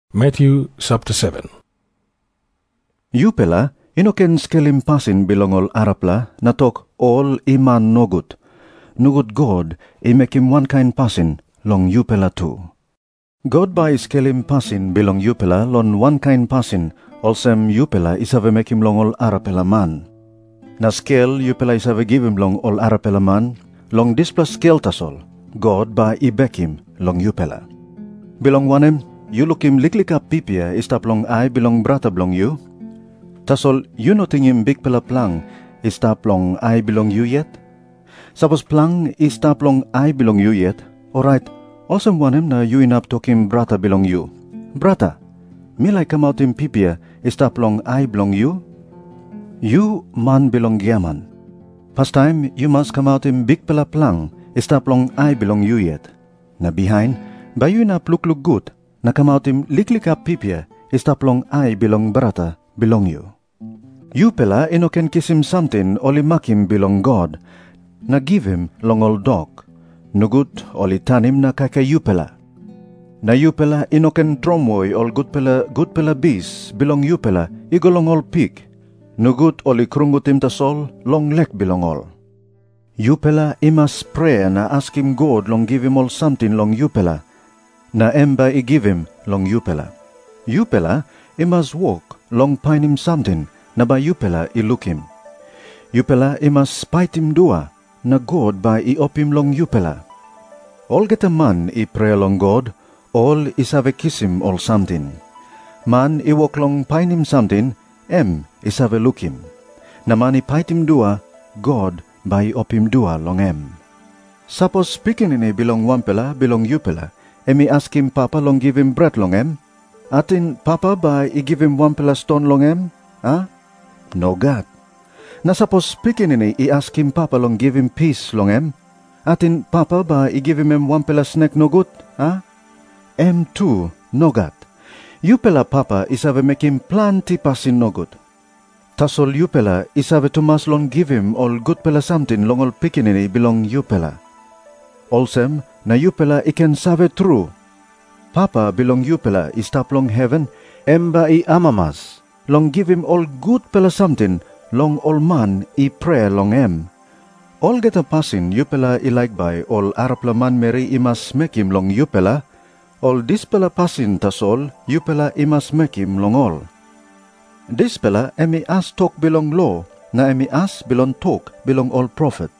Jisas i tok moa olsem, “Yupela i no ken skelim pasin bilong ol arapela na tok ol i man nogut. Nogut God i mekim wankain pasin long yupela tu. God bai i skelim pasin bilong yupela long wankain pasin olsem yupela i save mekim long ol arapela man. Na skel yupela i save givim long ol arapela man, long dispela skel tasol God bai i bekim long yupela. Bilong wanem yu lukim liklik hap pipia i stap long ai bilong brata bilong yu, tasol yu no tingim bikpela plang i stap long ai bilong yu yet? Sapos plang i stap long ai bilong yu yet, orait olsem wanem na yu inap tokim brata bilong yu, ‘Brata, mi laik kamautim pipia i stap long ai bilong yu’? Yu man bilong giaman, pastaim yu mas kamautim bikpela plang i stap long ai bilong yu yet. Na bihain bai yu inap lukluk gut na kamautim liklik hap pipia i stap long ai bilong brata bilong yu. “Yupela i no ken kisim samting ol i makim bilong God, na givim long ol dok. Nogut ol i tanim na kaikaim yupela. Na yupela i no ken tromoi ol gutpela gutpela bis bilong yupela i go long ol pik. Nogut ol i krungutim tasol long lek bilong ol.” Jisas i tok moa olsem, “Yupela i mas prea na askim God long givim ol samting long yupela, na em bai i givim long yupela. Yupela i mas wok long painim samting na bai yupela i lukim. Yupela i mas paitim dua, na God bai i opim long yupela. Olgeta man i prea long God, ol i save kisim ol samting. Man i wok long painim samting, em i save lukim. Na man i paitim dua, God bai i opim dua long em. “Sapos pikinini bilong wanpela bilong yupela em i askim papa long givim bret long em, ating papa bai i givim wanpela ston long em, a? Nogat. Na sapos pikinini i askim papa long givim pis long em, ating papa bai i givim em wanpela snek nogut, a? Em tu nogat. Yupela papa i save mekim planti pasin nogut, tasol yupela i save tumas long givim ol gutpela samting long ol pikinini bilong yupela. Olsem na yupela i ken save tru, Papa bilong yupela i stap long heven em bai i amamas long givim ol gutpela samting long ol man i prea long em. “Olgeta pasin yupela i laik bai ol arapela manmeri i mas mekim long yupela, ol dispela pasin tasol yupela i mas mekim long ol. Dispela em i as tok bilong lo, na em i as bilong tok bilong ol profet.”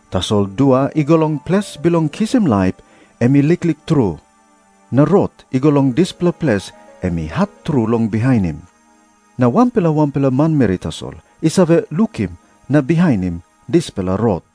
Tasol dua i go long ples bilong kisim laip, em i liklik tru, na rot i go long dispela ples em i hat tru long bihainim. Na wanpela wanpela manmeri tasol i save lukim na bihainim dispela rot.”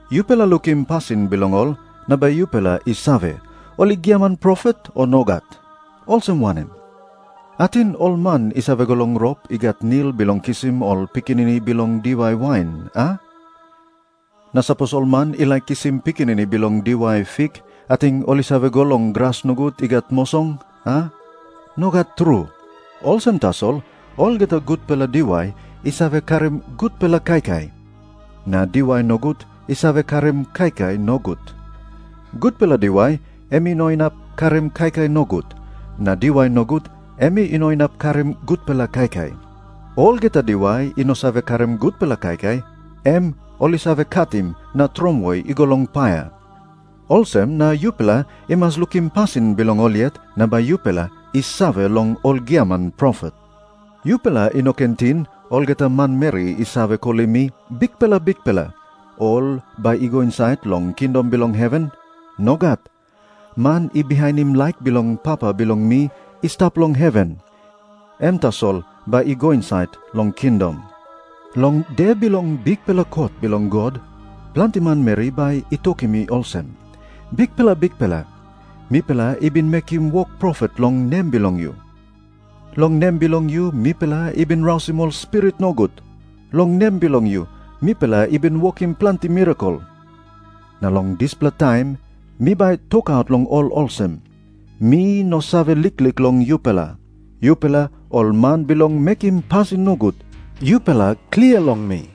Yupela lukim pasin bilong ol na bai yupela i save, ol i giaman profet, o nogat. Olsem wanem? Ating ol man i save go long rop i gat nil bilong kisim ol pikinini bilong diwai wain, a? Na sapos ol man i laik kisim pikinini bilong diwai fik, ating ol i save go long gras nogut i gat mosong, a? Nogat tru. Olsem tasol olgeta gutpela diwai i save karim gutpela kaikai. Na diwai nogut i save karim kaikai nogut. Gutpela diwai em i no inap karim kaikai nogut. Na diwai nogut em i no inap karim gutpela kaikai. Olgeta diwai i no save karim gutpela kaikai, em ol i save katim na tromoi i go long paia. Olsem na yupela i mas lukim pasin bilong ol yet na bai yupela i save long ol giaman profet. “Yupela i no ken ting, olgeta manmeri i save kolim mi, ‘Bikpela, Bikpela,’ ol bai i go insait long kingdom bilong heven. Nogat. Man i bihainim laik bilong Papa bilong mi i stap long heven, em tasol bai i go insait long kingdom. Long de bilong bikpela kot bilong God, planti manmeri bai i tokim mi olsem, ‘Bikpela, Bikpela, mipela i bin mekim wok profet long nem bilong yu. Long nem bilong yu mipela i bin rausim ol spirit nogut. Long nem bilong yu mipela i bin wokim planti mirakel.’ Na long dispela taim mi bai tokaut long ol olsem, ‘Mi no save liklik long yupela. Yupela ol man bilong mekim pasin nogut, yupela klia long mi.’”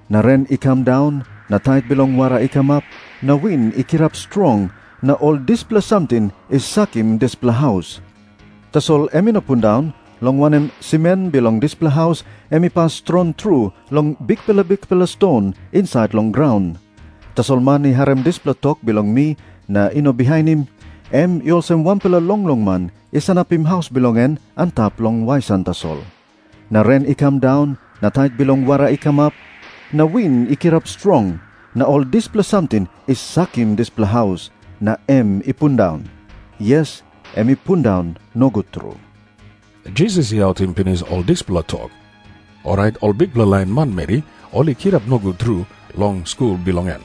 Na ren i kam daun, na tait bilong wara i kamap, na win i kirap strong, na ol dispela samting i sakim dispela haus. Tasol em i no pundaun, long wanem, simen bilong dispela haus em i pas strong tru long bikpela bikpela ston insait long graun. Tasol man i harim dispela tok bilong mi na i no bihainim, em i olsem wanpela longlong man i sanapim haus bilong en antap long wesan tasol. Na ren i kam daun, na tait bilong wara i kamap, na win i kirap strong. Na ol dispela samting i sakim dispela haus, na em i pundaun. Yes, em i pundaun nogut tru.” Jisas i autim pinis ol dispela tok, orait ol bikpela lain manmeri ol i kirap nogut tru long skul bilong en.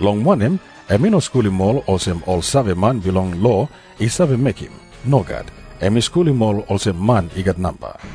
Long wanem, em i no skulim ol olsem ol saveman bilong lo i save mekim. Nogat. Em i skulim ol olsem man i gat namba.